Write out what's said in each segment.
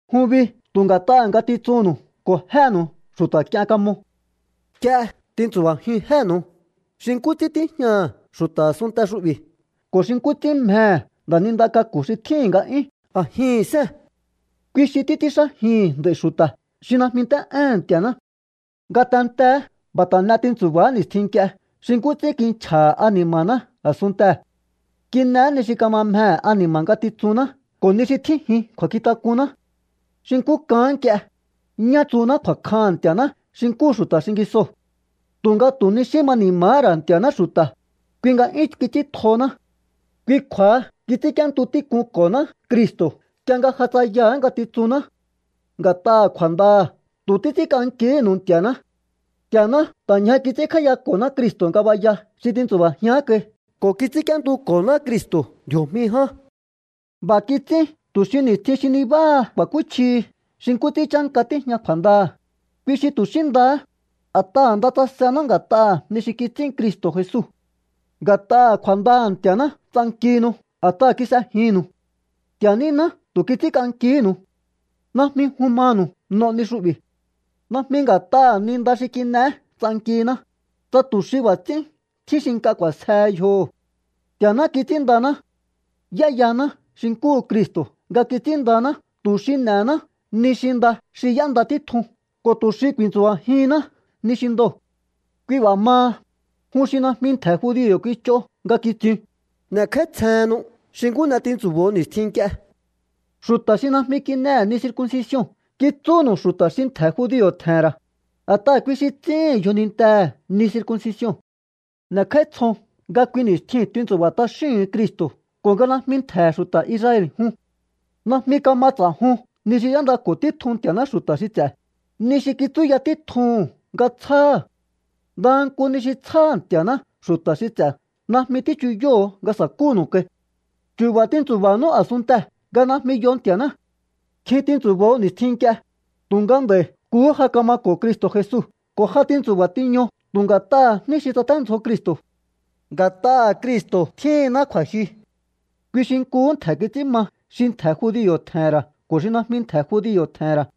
Jun bi tu̱ nga̱t'aha̱ ngatitsunnu̱u ko̱ jénu̱u xu̱ta̱k'ien kamo. Nk'ie tintsu̱ba̱jiun jénu̱u xi nkú ts'ín tíjñaha̱ xu̱ta̱ a̱sunnte xu'bi̱ ko̱ xi nkú ts'ín mjehe̱ nda̱ninda k'aku̱ xi tjíhi̱n nga'yún a̱jihi̱n sée̱n. Kui xi títs'ínxájihi̱n nd'a̱i̱ xu̱ta̱ xi najmi nt'é'éhe̱n Nti̱a̱ná. Ngatenteé b'a̱ ta̱ n'e tintsu̱ba̱á ni̱stjin nk'ie xi nkú ts'ín kinchja̱ha̱ ani̱ma̱ná a̱sunntee̱. Kin'eé ni xi kama mjehe̱ ani̱ma̱ ngatitsunná ko̱ ni xi tjínjin kju̱a̱nkjink'unná. Xi nkú k'aán nk'ie, ñá tsuhuná kju̱a̱kjaha̱n Nti̱a̱ná xi nkúhu xu̱ta̱ xingisoo̱. Tu̱nga tu̱ ni xí ma ni̱ma̱há ra̱ Nti̱a̱ná xu̱ta̱, kui nga 'yún kits'íntjohoná. Kui kju̱a̱ha kits'ínk'íéntu tík'unko̱honá Cristo̱ nk'ie nga ja tsayaha̱á ngatitsunná. Nga̱t'aha̱ kju̱a̱ndaha̱ tu̱ títs'ínk'ankihínu̱u Nti̱a̱ná. Nti̱a̱ná ta̱ ñja kits'ínkj'áíyako̱ná Cristo̱ ngabaya xi tintsu̱ba̱jián kai ko̱ kits'ínk'íéntuko̱ná Cristo̱ ndji̱o̱jmi ján. B'a̱ kits'ín tu̱ xi ni̱stjin xi nibáha ku̱a̱kúchjihi xi nkú ts'ín chánka tíjña kju̱a̱ndaha̱, kui xi tu̱ xí ndahá, a̱t'aha̱ nda tsasená nga̱t'aha̱ ni xi kits'ín Cristo̱ Jesu. Nga̱t'aha̱ kju̱a̱ndaha̱ Nti̱a̱ná ts'ankihinu a̱t'aha̱ kis'ejinnu̱u. Nti̱a̱ níná tu̱ kits'ínk'ankihínu̱u. Najmi jun manu̱u n'o ni xu'bi̱. Najmi nga̱t'aha̱ ni nda xi kin'eé ts'ankihiná, tsa tu̱ xi b'a̱ ts'ín tjín xi nk'a k'u̱a̱sjehe yjoho̱. Nti̱a̱ná kits'ínndaná. Y'éyaná xi nkúhu Cristo̱ nga kits'ínndaná tu̱ xi n'e̱hená ni xi nda xi y'énda títjun ko̱ tu̱ xi ku̱i̱ntsu̱ba̱jihinná ni xi ndoo̱. Kui b'a̱ maha, jun xi najmi ntje̱ judio̱ kich'o nga kitsiun, n'e̱kj'áítsjehennu xi nkú n'e tintsu̱bo̱o ni̱stjin nk'ie. Xu̱ta̱ xi najmi kin'ehe̱ ni circuncision kitsúnu̱u xu̱ta̱ xi ntje̱ judio̱ tje̱he̱n ra̱, a̱t'aha̱ kui xi ts'íhi̱n yjoninintehe̱ ni circuncision. N'e̱kj'áítsjon nga kui ni̱stjiu̱n tintsu̱ba̱ t'axíhu̱un Cristo̱ ko̱ nga najmi ntje̱he̱ xu̱ta̱ Israel jun. Najmi kama ts'a̱jun ni xi y'éndako̱ títjun Nti̱a̱ná xu̱ta̱ xi ts'e̱, ni xi kitsúya títjuhu̱n nga tsjáha̱. Ndaha nku ni xi tsjáha̱ Nti̱a̱ná xu̱ta̱ xi ts'e̱ najmi tíchuyóho̱o nga sa̱kúnu̱u kai. Chu̱ba̱ tintsu̱ba̱nú a̱sunntee̱ nga najmi yo Nti̱a̱ná. Kjin tintsu̱bo̱o ni̱stjin nk'ie, tu̱nga nd'a̱i̱ nkuhú ja kamako̱o Cristo̱ Jesu ko̱ ja tintsu̱ba̱ tiño tu̱ nga̱t'aha̱ jní xi tsaténdzjo Cristo̱. Nga̱t'aha̱ Cristo̱ tjíhinná kju̱a̱jyu. Kui xi nkuhú ntje̱ kits'ín ma xi ntje̱ judio̱ tje̱he̱n ra̱ ko̱ xi najmi ntje̱ judio̱ tje̱he̱n ra̱.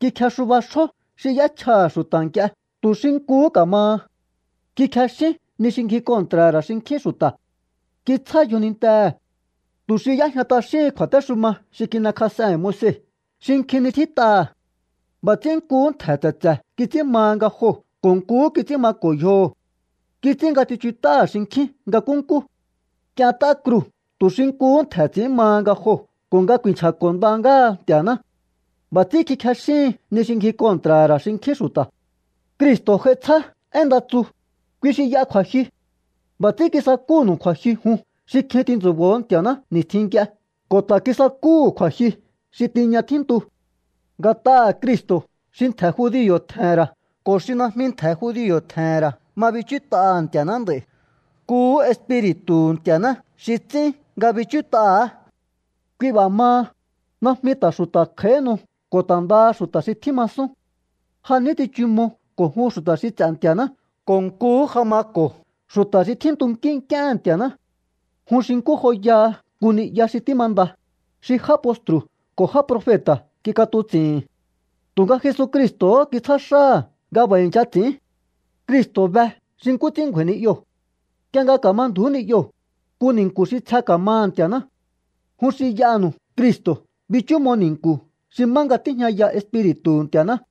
Kikjexuba xjó xi y'échjaha̱ xu̱ta̱ nk'ie tu̱ xi nkuhú ka̱maha. Kikjexín ni xi ngji kontra̱ha̱ ra̱ xinkjín xu̱ta̱. Kitsjá yjonintehe̱ tu̱ xi y'éjña t'axíhin kju̱a̱téxuma xi kin'ekjas'ehe̱n Moise xi nkjin ni tjít'aha̱. B'a̱ ts'ín nkuhú ntje̱ tse̱tse̱ kits'ín maha nga joo̱ ko̱ nkuhú kits'ín mako̱ yjoho̱. Kits'ín nga tsichut'áha̱ xinkjín nga nkúnkú. K'ient'á kruu̱ tu̱ xi nkuhú ntje̱ ts'i̱ín maha nga joo̱ ko̱ nga ku̱i̱nchja̱ko̱ nda ngáha Nti̱a̱ná. B'a̱ ts'ín kikjexíhin ni xi ngji kontra̱ha̱ ra̱ xinkjín xu̱ta̱. Cristo̱ j'ai tsjá én nda tsu, kui xi y'a kju̱a̱jyu. B'a̱ ts'ín kisakúhu̱nu̱u kju̱a̱jyu jun xi kjin tintsu̱bo̱ho̱ Nti̱a̱ná ni̱stjin nk'ie ko̱ ta̱ kisakúhu̱ kju̱a̱jyu xi tiña tjíntu. Nga̱t'aha̱ Cristo̱ xi ntje̱ judio̱ tje̱he̱n ra̱ ko̱ xi najmi ntje̱ judio̱ tje̱he̱n ra̱ ma bichút'aha̱ Nti̱a̱ná nd'a̱i̱. Nkuhú Espi̱ri̱tu̱hu̱ Nti̱a̱ná xi ts'ín nga bichút'aha̱á. Kui b'a̱ maha, najmi ta̱ xu̱ta̱ kj'a̱íhinu ko̱ ta̱ ndaha xu̱ta̱ xi tjímasún. Ja ní tsichumo ko̱ jun xu̱ta̱ xi ts'e̱ Nti̱a̱ná ko̱ nkuhú ja mako̱o xu̱ta̱ xi tjíntunkí nk'íéhe̱n Nti̱a̱ná. Jun xi nkú joyaha nku ni'ya xi tímanda, xi já postru̱ ko̱ já profeta̱ kik'atuts'i̱hi̱n. Tu̱nga Jesucristo̱hó kitsjá xáha̱ nga b'a̱ i̱ncha ts'i̱ín. Cristo̱ be xi nkú ts'ín ngju̱a̱i̱ ni'yoo̱. Nk'ie nga ka̱ma ndju̱ú ni'yoo̱, nku ni̱nku̱ xi tsje ka̱maha̱ Nti̱a̱ná. Jun xi y'aha̱nu̱u Cristo̱ bichúmo ni̱nku̱ xi má nga tíjñaya Espiri̱tu̱hu̱ Nti̱a̱ná.